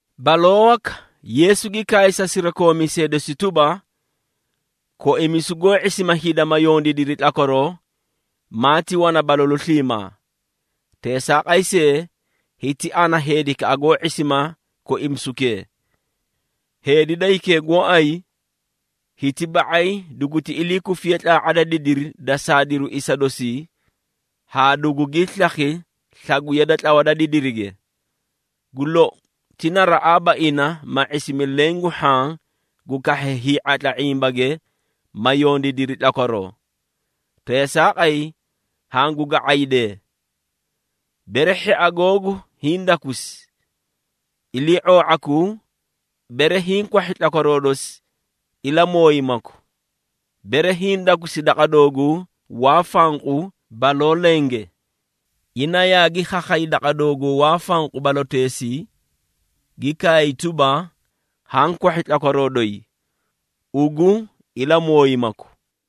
Baloo waka, Yeesu gi kaay sa sirakoomiisee dosi tuba, “Koimisu goó ⁄isima hida ma yondiidiri tlakwaroo, maati wana balalu sliimaa. Teesaaqay see, hiti ana heedikaꞌa goó ⁄isima koimisukee! Heedi da hikee gooay, hiti ba⁄ay duguti ilii kufi tlaa⁄a da didiri da saadiruu isa dosii haa dugugii slakhi slagwiya da tlawa da didirige. Gu lou, ti naraꞌaaba ina ma ⁄isimi leẽ gu hhaã gu kahhee hii⁄atla ⁄imbage, ma yondiidiri tlakwaroo. Teesaaqay, hangu ga⁄aydee! Bere hhia googu hiĩ dakusi, ilii⁄oo⁄akuu, bere hiĩ kwahhi tlakwaroo dosi, ilamooyimaku. Bere hiĩ dakusi daqa dooguu waa fanqu baloo lenge, ina yaagi khakhay daqa dooguu waa fanqu baloteesii, gi kaay tuba, ‘Haã kwahhi tlakwaroo doyi.’ Ugu ilamooyimaku.”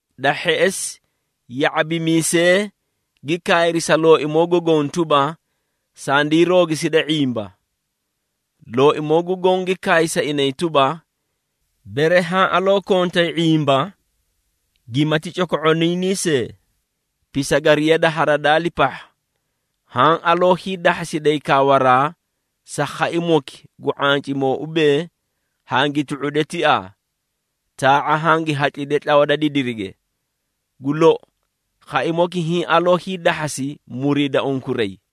Da hheꞌesi, ya⁄abimiisee gi kaayri sa Looimoo gu Goõ tuba, “Sandii roogiside ⁄imba.” Looimoo gu Goõ gi kaay sa inay tuba, “Bere haã aloo kontay ⁄imba gimati coko⁄oniinii see, pisagariya da haradaali pahha, haã aloo hiidahhasiday kaawaraa sa khaimoki gu ⁄ancimoo ubee, ‘Hangi tu⁄ude tiaa, taa⁄a hangi hatlide tlawa da didirige.’ Gu lou, khaimoki hiĩ aloo hiidahhasi muriida unkuray.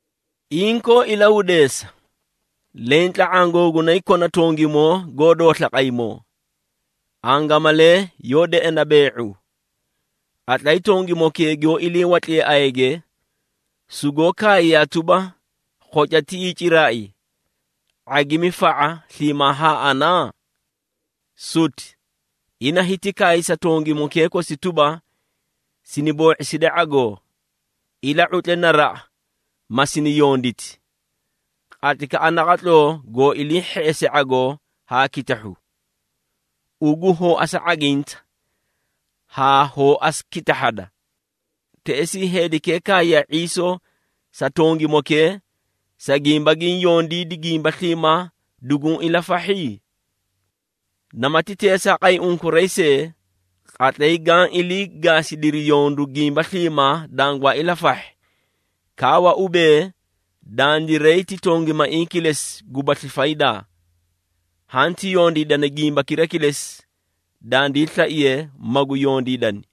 Inkoo ilahudeesa, leẽ tla⁄aã googunay kona tongimoo goó doosla qaymoo, angamalee yoó deꞌena bee⁄u. Qatlay tongimokee giyoó ilii watliye ayage, sugoó kaayiyaa tuba, ‘Khoca tiꞌii ciraai, ⁄agimi fa⁄a sliimaa haa ana?’ Suti! Ina hiti kaay sa tongimokee kosi tuba, ‘Sini boo⁄iside ⁄agoo, ila⁄utle naraꞌa ma sini yonditi, qatlaykaꞌa naqatloo goo ilii hheꞌese ⁄agoo haa kitahhu. Ugu hoo asu ⁄aginta haa hoo asu kitahhada.’ Teꞌesii, heedikee kaayiyaa ⁄iisoo sa tongimokee, sa gimba giĩ yondiidi, gimba sliimaa duguũ ilafahhi? Namati teesaaqay unkuray see, qatlay gaã ilii gaasidiri yondu gimba sliimaa dangwaa ilafahhi, kaawa ubee, ‘Dandiray ti tongimaiĩ kilesi gubasli faydaa. Hanti yondiidani gimbakira kilesi, dandii slaiye magu yondiidani.’”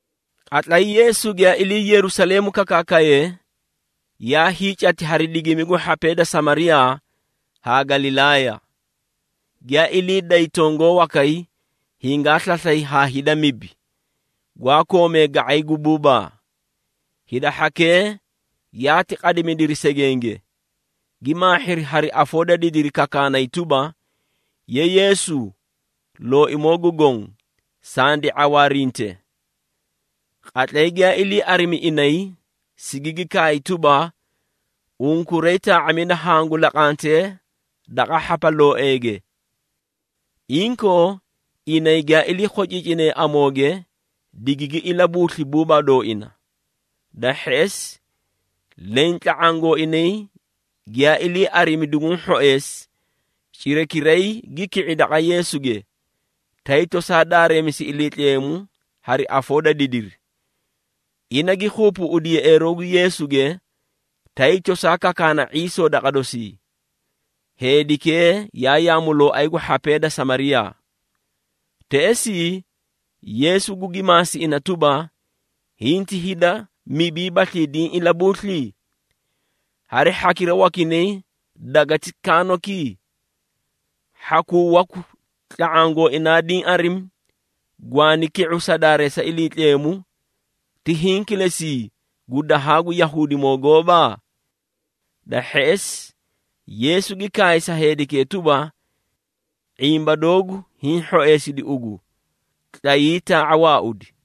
Qatlay Yeesu giyaa ilii Yerusaleemu kakaakaye, yaa hiicati hari digimi gu hhapee da Samariyaa haa Galilaaya. Giyaa ilii day tongoo wakay, hingaa slaslay haa hida mibi, gwaa koomee ga⁄ay gu buubaa. Hida hhakee yaati qadimidiri segenge, gi maahhiri hari afoo da didiri kakaanay tuba, “Ye Yeesu, Looimoo gu Goõ, sandi ⁄awaarinte!” Qatlay giyaa ilii arimi inay, sigigi kaay tuba, “Unkuray, taa⁄amida hangu laqantee daqa hhapalooeege.” Inkoo, inay giyaa ilii khociicinee amooge, digigi ilabuusli buubaa dooina. Da hheꞌesi, leẽ tla⁄aã gooinay giyaa ilii arimi duguũ hhoeesi, cirakiray gi ki⁄i daqa Yeesuge, tay tosaa daareemisi Iliitleemu hari afoo da didiri. Ina gi keebeeꞌedi yeꞌeeroo gu Yeesuge, tay tosaa kakaana ⁄iisoo daqa dosii. Heedikee yaa yaamulooay gu hhapee da Samariyaa. Teꞌesii, Yeesu gugi maasi ina tuba, “Hinti hida mibiibaslii diĩ ilabuusli? Hari hhakira wakinay gweleti kaanoki? Hhakuu waku tla⁄aã gooinaa diĩ arimi, gwaani ki⁄u sa daareesa Iliitleemu, ti hiĩ kilesii gu dahaa gu Yahuudimoo gooba?” Da hheꞌesi, Yeesu gi kaay sa heedikee tuba, “⁄imba doogu hiĩ hhoeesidi ugu. Tlayii, taa⁄a waaudi.”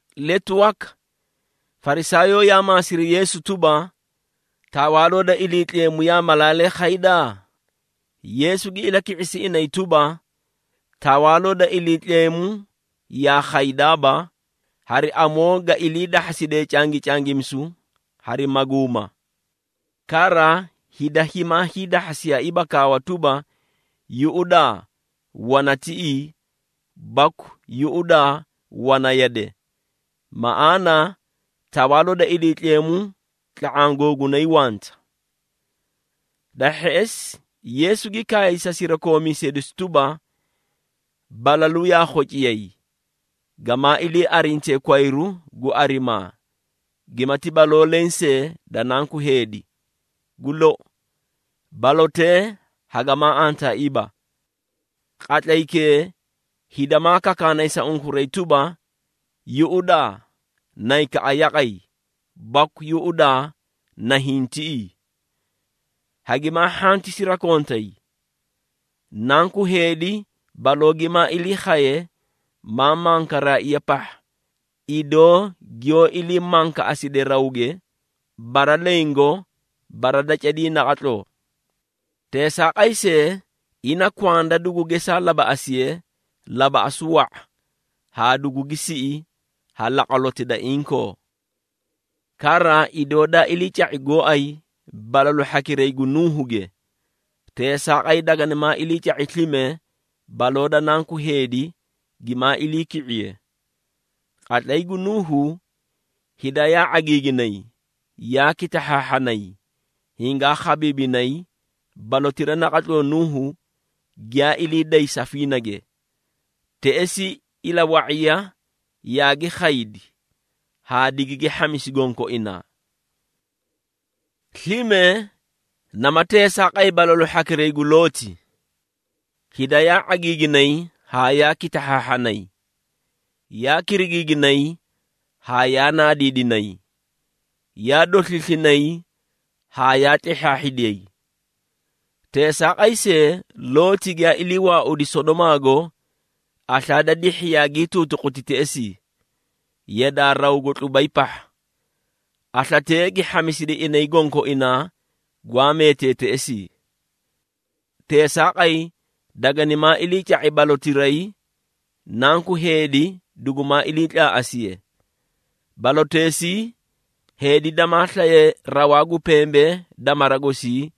Letu waka, Farisaayoo yaa maasiri Yeesu tuba, “Tawaaloo da Iliitleemu yaa malaalee khayda?” Yeesu gi ilaki⁄isi inay tuba, “Tawaaloo da Iliitleemu yaa khaydaaba, hari amoo ga iliidahhaside cangicangimisu hari maguuma. Kara, hida himaa hiidahhasiyaiiba kaawa tuba, ‘Yuꞌudaa, wana tiꞌii!’ baku ‘Yuꞌudaa, wana yade!’ Maꞌaana, Tawaaloo da Iliitleemu tla⁄aã googunay wanta.” Da hheꞌesi, Yeesu gi kaay sa sirakoomiisee dosi tuba, “Balalu yaa khociyay, gamaa ilii arintee kwayru, gu arimaa gimati baloo leẽ see da Nanku Heedi. Gu lou, balotee hagamaa antaaiiba. Qatlaykee, hida maa kakaanay sa unkuray tuba, ‘Yuꞌudaa! Naykaꞌa yaqay!’ baku ‘Yuꞌudaa! Nahiĩ tiꞌii!’ Hagimaa hhanti sirakontay. Nanku Heedi baloo gimaa ilii khaye, maa mankaraaiya pahha, idoo giyoó ilii mankaꞌaside rawge, bara lengo, bara da cadii naqatloo. Teesaaqay see, ina kwanda dugu gesaa labaꞌasiye, labaꞌasu wa⁄a haa dugugi siꞌi ha laqwaloti da inkoo. Kara, idoo daa iliica⁄i gooay balalu hhakiray gu Nuuhuge, teesaaqay daganimaa iliica⁄i slime baloo da Nanku Heedi gimaa iliiki⁄iye. Qatlay gu Nuuhu, hida yaa ⁄agiiginay, yaa kitahhaahhanay, hingaa khabiibinay balotira naqatloo Nuuhu giyaa ilii day safiinage. Teꞌesii, ilawa⁄iya yaagi khaydi haa digigi hhamisi gonkoinaa. Slime, naama teesaaqay balalu hhakira gu Looti. Hida yaa ⁄agiiginay haa yaa kitahhaahhanay, yaa kirigiiginay haa yaa naadiidinay, yaa dosliislinay haa yaa tlehhaahhidiyay. Teesaaqay see, Looti giyaa ilii waaudi Sodomaago, aslaa da dihhi yaagii tuutuquti teꞌesii, yadaa rawgo tlubay pahha. Aslatee gi hhamisidi inay gonkoinaa gwaa meetee teꞌesii. Teesaaqay, daganimaa iliica⁄i balotirayi, Nanku Heedi dugumaa iliitlaaꞌasiye. Baloteesii, heedi damaa slaye rawaa gu pembee da mara gosii,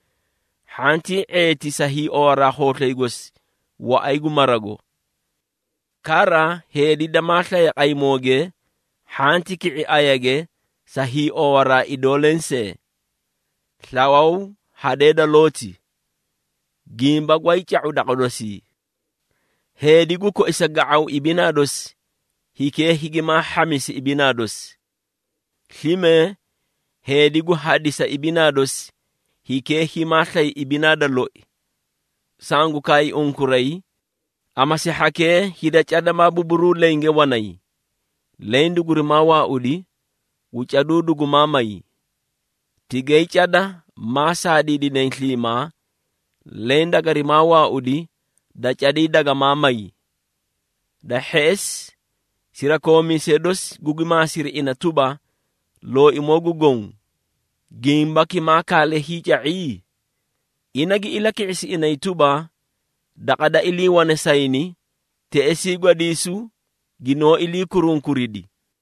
hhantii ⁄eeti sa hiiowaraa khooslay gosi waꞌay gu marago. Kara, heedi damaa slaye qaymooge, hhanti ki⁄i ayage sa hiiowaraa idoo lensee. Slawaw hadee da Looti, gimba gwaay ca⁄u daqa dosii! Heedi gu koisa ga⁄aw ibinaa dosi, hikee higimaa hhamisi ibinaa dosi. Slime, heedi gu hadisa ibinaa dosi, hikee himaa slay ibinaa da loi. Sangu kaay unkuray, amasi hhakee hida cada maa buburuu lenge wanay, leẽ dugurimaa waaudi, gu caduu dugumaa may. Tigay cada maa saadiidinay sliimaa, leẽ dagarimaa waaudi, da cadii dagamaa may.” Da hheꞌesi, sirakoomiisee dosi gugi maasiri ina tuba, “Looimoo gu Goõ, gimbaki maa kaale hiica⁄i?” Ina gi ilaki⁄isi inay tuba, “Daqa da iliiwane sayni, teꞌesii gwadiisu ginoó ilii kurunkuridi.”